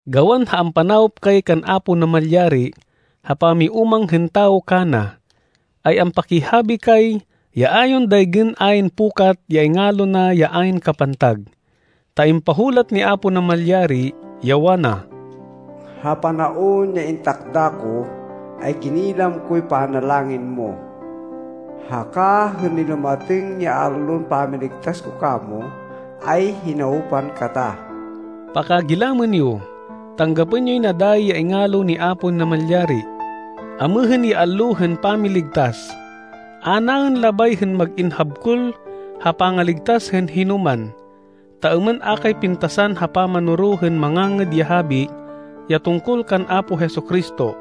Gawan ha ampanawop kay kan Apo Namalyari ha pamiúmang hên tawo kana, ay ampakihabi kay ya a yon daygên ayn pukat ya ingalo na ya ayn kapantag. Ta impahulat ni Apo Namalyari, ya wana, “Ha panaon ya intakda ko, ay ginilam koy panalangin mo. Haka hên nilumatêng ya allon pamiligtas ko kamo, ay hinawpan kata.” Pakagilamên yo! Tanggapên yoy na dayi ya ingalo ni Apo Namalyari! Amêhên ya allo hên pamiligtas! A naên labay hên mag-in habkol ha pangaligtas hên hinoman, ta êmên a kay pintasan ha pamanoro hên Mangangêd ya Habi ya tungkol kan Apo Jesu-Cristo.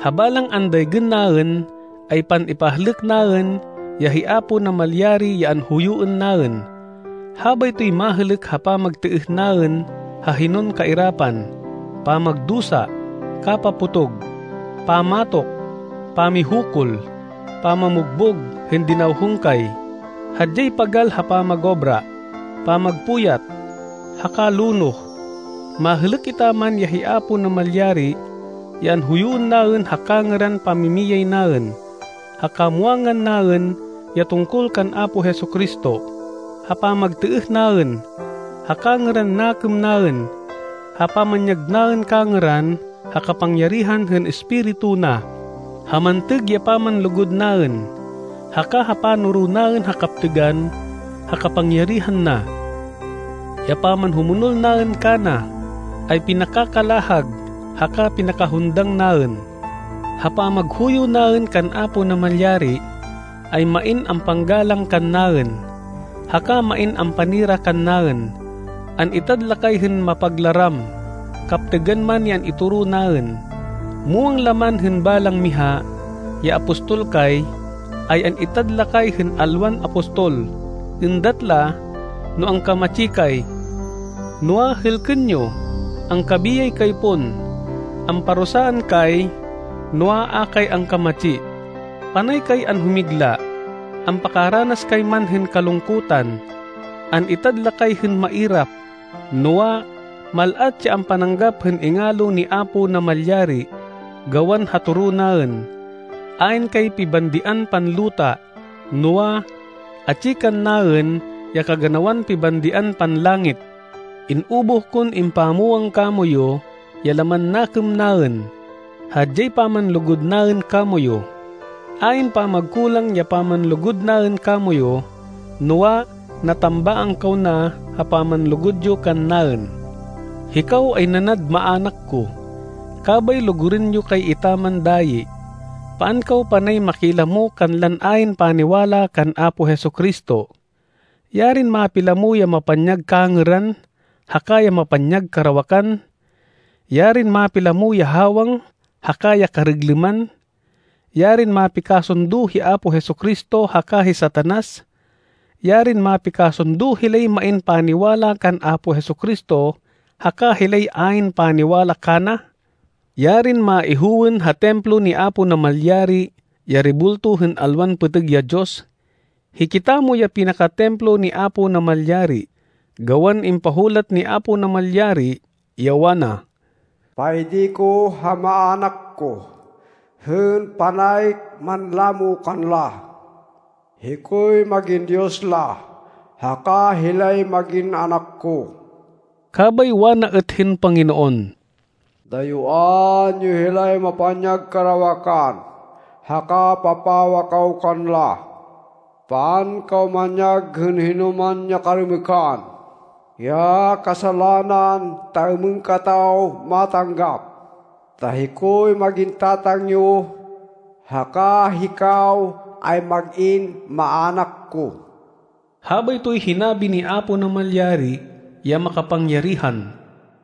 Ha balang andaygên naên, ay pan-ipahlêk naên, ya hi Apo Namalyari ya anhuyuên naên. Habaytoy mahêlêk ha pamagtêêh naên ha hinon kairapan, pamagdusa, kapapotog, pamatok, pamihukul, pamabugbog hên dinawhong kay, hadyay pagal ha pamagobra, pamagpuyat, haka lonoh. Mahêlêk etaman ya hi Apo Namalyari ya anhuyuên naên ha kangêran pamimiyay naên, ha kamwangan naên ya tungkol kan Apo Jesu-Cristo, ha pamagtêêh naên, ha kangêran nakêm naên, ha pamanyag naên kangêran ha kapangyarihan hên Espiritu na, ha mantêg ya pamanlugud naên, haka ha panoro naên hên kaptêgan ha kapangyarihan na. Ya pamanhumonol naên kana, ay pinakakalahag haka pinakahundang naên. Ha pamaghuyo naên kan Apo Namalyari, ay main ampanggalang kannaên, haka main ampanira kannaên. An-itad la kay hên mapaglaram, kaptêgan man ya an-itoro naên. Muwang la man hên balang miha, ya apostol kay, ay an-itad la kay hên alwan apostol. Êndat la, no angkamatsi kay. Noa, hêlkên yo, angkabiyay kay pon! Amparusaan kay, noa, a kay angkamatsi. Panay kay anhumigla, ampakaranas kay man hên kalungkutan. An-itad la kay hên mairap, noa, mal-at ya ampananggap hên ingalo ni Apo Namalyari, gawan ha toro naên. Ayn kay pibandian panluta, noa, atsi kannaên ya kaganawan pibandian panlangit. In-ubuh kon impamwang kamoyu ya laman nakêm naên. Hadyay pamanlugud naên kamoyu. Ayn pamagkulang ya pamanlugud naên kamoyu, noa, natambaang kaw na ha pamanlugud yo kannaên. Hikaw ay nanad maának ko, kabay lugurên yo kay etaman dayi. Paan kaw panay makilamo kanlan ayn paniwala kan Apo Jesu-Cristo. Yarin mapilamo ya mapanyag kangêran haka ya mapanyag karawakan! Yarin mapilamo ya hawang haka ya kariglêman! Yarin mapikasundo hi Apo Jesu-Cristo haka hi Satanas! Yarin mapikasundo hilay main paniwala kan Apo Jesu-Cristo haka hilay ayn paniwala kana! Yarin maihowên ha Templo ni Apo Namalyari, ya rebulto hên alwan pêtêg ya diyos! Hikitamo ya pinaka-Templo ni Apo Namalyari, gawan impahulat ni Apo Namalyari, ya wana, “Paidi ko ha maának ko, hên panay manlamo kanla. Hikoy mag-in Diyos la, haka hilay mag-in anak ko.” Kabay wana êt hên Panginoon, “Dayuán yo hilay mapanyag karawakan, haka papawa kaw kanla.” “Paan kaw manyag hên hinoman ya karêmêkan, ya kasalanan, ta êmên kataw matanggap. Ta hikoy mag-in Tatang yo, haka hikaw ay mag-in maának ko.” Habaytoy hinabi ni Apo Namalyari ya makapangyarihan.